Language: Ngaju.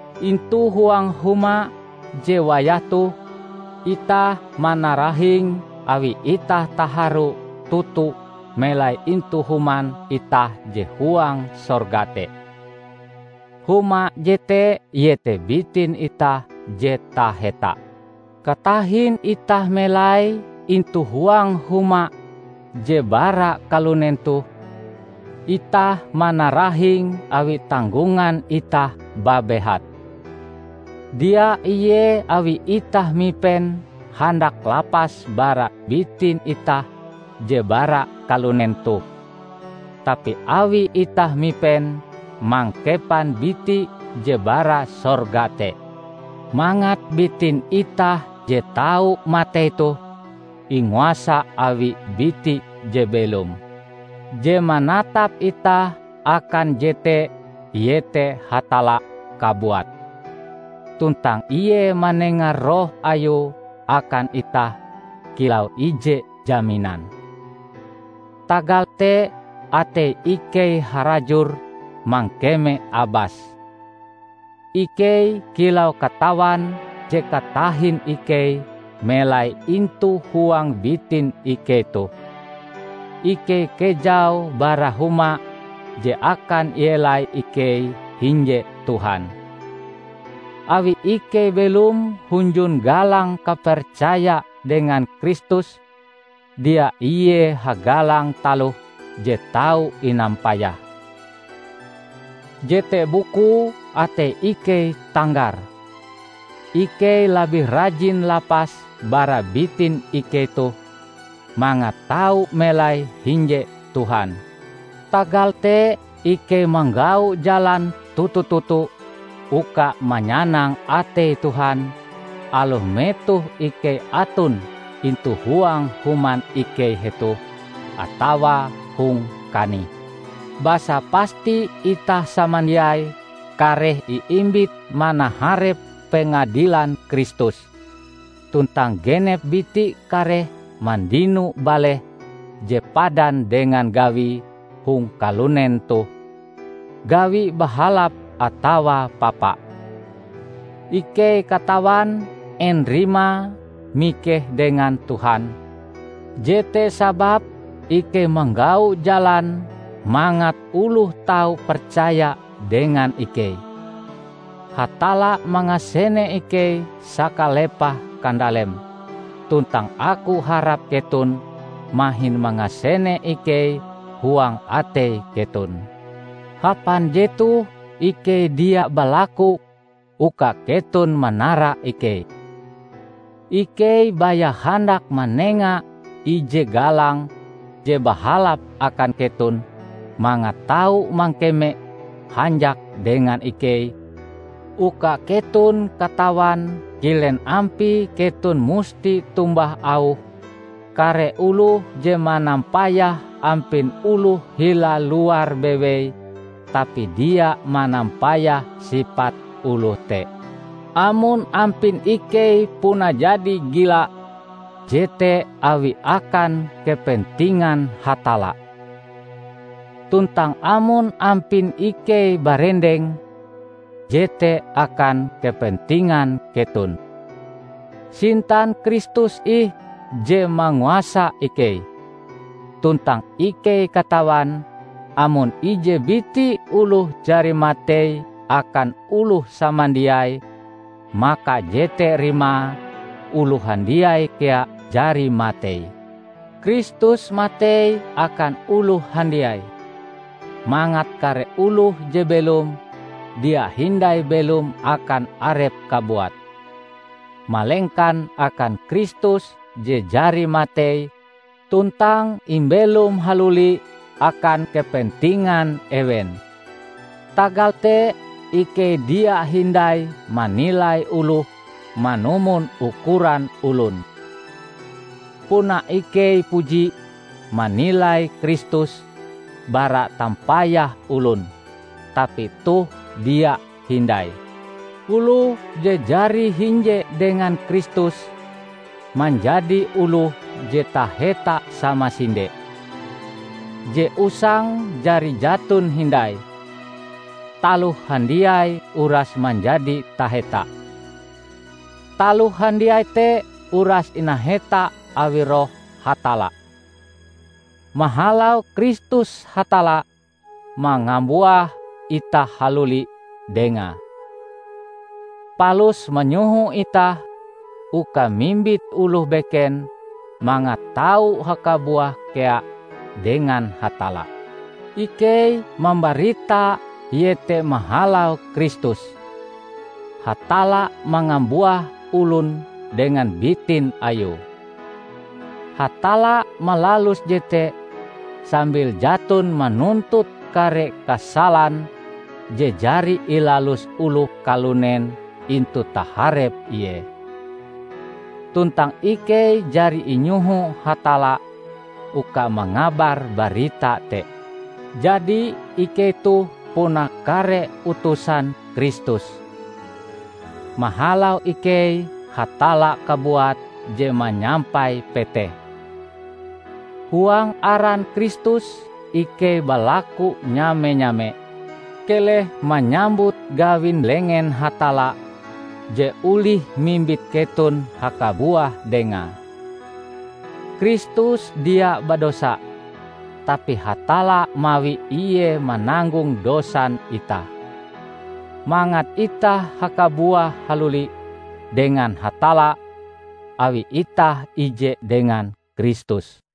Intu huang huma je wayah toh, itah manarahing awi itah taharu toto melai intu human itah je huang sorga te. Huma jete iete bitin itah je taheta. Katahin itah melai intu huang huma je bara kalunen toh, itah manarahing awi tanggongan itah babehat. Dia ie awi itah mipen handak lapas bara bitin itah je bara kalunen toh, tapi awi itah mipen mangkepan biti je bara sorga te, mangat bitin itah je tau matei toh inguasa awi biti je belom. Je manatap itah akan jete iete Hatalla kabuat, tuntang ie manenga Roh ayue akan itah kilau ije jaminan. Tagal te atei ikei harajur mangkeme abas. Ikei kilau katawan je katahin ikei melai intu huang bitin ikei toh, ikei kejau bara huma je akan ielai ikei hinje Tuhan. Awi ikei belom hunjun galang kapercaya dengan Kristus, dia ie hagalang taloh je tau inampayah, jete bukue atei ikei tanggar. Ikei labih rajin lapas bara bitin ikei toh, mangat tau melai hinje Tuhan. Tagal te ikei manggau jalan toto-toto uka manyanang atei Tuhan aloh metoh ikei aton intu huang human ikei hetoh, atawa hong kanih. Basa pasti itah samandiai kareh iimbit manaharep pengadilan Kristus, tuntang genep biti kareh mandino baleh je padan dengan gawie hong kalunen toh -- gawi bahalap atawa papa. Ikei katawan en rimae mikeh dengan Tuhan; jete sababe ikei manggau jalan mangat oloh tau percaya dengan ikei. Hatalla mangasene ikei sakalepah kandaleme, tuntang aku harap keton mahin mangasene ikei huang atei keton. Hapan jetoh ikei dia balaku uka keton manara ikei. Ikei baya handak manenga ije galang je bahalap akan keton mangat tau mangkeme hanjak dengan ikei, uka keton katawan kilen ampie keton musti tombah auh kare oloh je manampayah ampin oloh hila luar bewei tapi dia manampayah sipat oloh te. Amon ampin ikei puna jadi gila, jete awi akan kepentingan Hatalla. Tuntang amon ampin ikei barendeng, jete akan kepentingan keton. Sintan Kristus ih je manguasa ikei; tuntang ikei katawan amon ije biti oloh jari matei akan oloh samandiai, maka jete rimae oloh handiai kea jari matei. Kristus matei akan oloh handiai, mangat kare oloh je belom, dia hindai belom akan arepe kabuat, malengkan akan Kristus je jari matei tuntang imbelom haluli akan kepentingan ewen. Tagal te, ikei dia hindai manilai oloh manumon ukuran olon. Puna ikei puji manilai Kristus bara tampayah olon, tapi toh dia hindai. Oloh je jari hinje dengan Kristus, manjadi oloh je taheta samasinde. Je usang jari jaton hindai -- taloh handiai uras manjadi taheta. Taloh handiai te uras inaheta awi Roh Hatalla. Mahalau Kristus Hatalla mangambuah itah haluli dengae, palus manyoho itah uka mimbit oloh beken mangat tau hakabuah kea dengan Hatalla. Ikei mambarita iete mahalau Kristus, Hatalla mangambuah olon dengan bitin Ayue. Hatalla malalus jete sambil jaton manuntut kare kasalan je jari ilalus oloh kalunen intu taharep Ie. Tuntang ikei jari inyoho Hatalla uka mangabar barita te. Jadi ikei toh puna kare utusan Kristus. Mahalau ikei Hatalla kabuat je manyampai petehe. Huang aran Kristus ikei balaku nyame-nyame, keleh manyambut gawin lengen Hatalla je olih mimbit keton hakabuah dengae. Kristus dia badosa, tapi Hatalla mawi ie mananggong dosan itah, mangat itah hakabuah haluli dengan Hatalla awi itah ije dengan Kristus.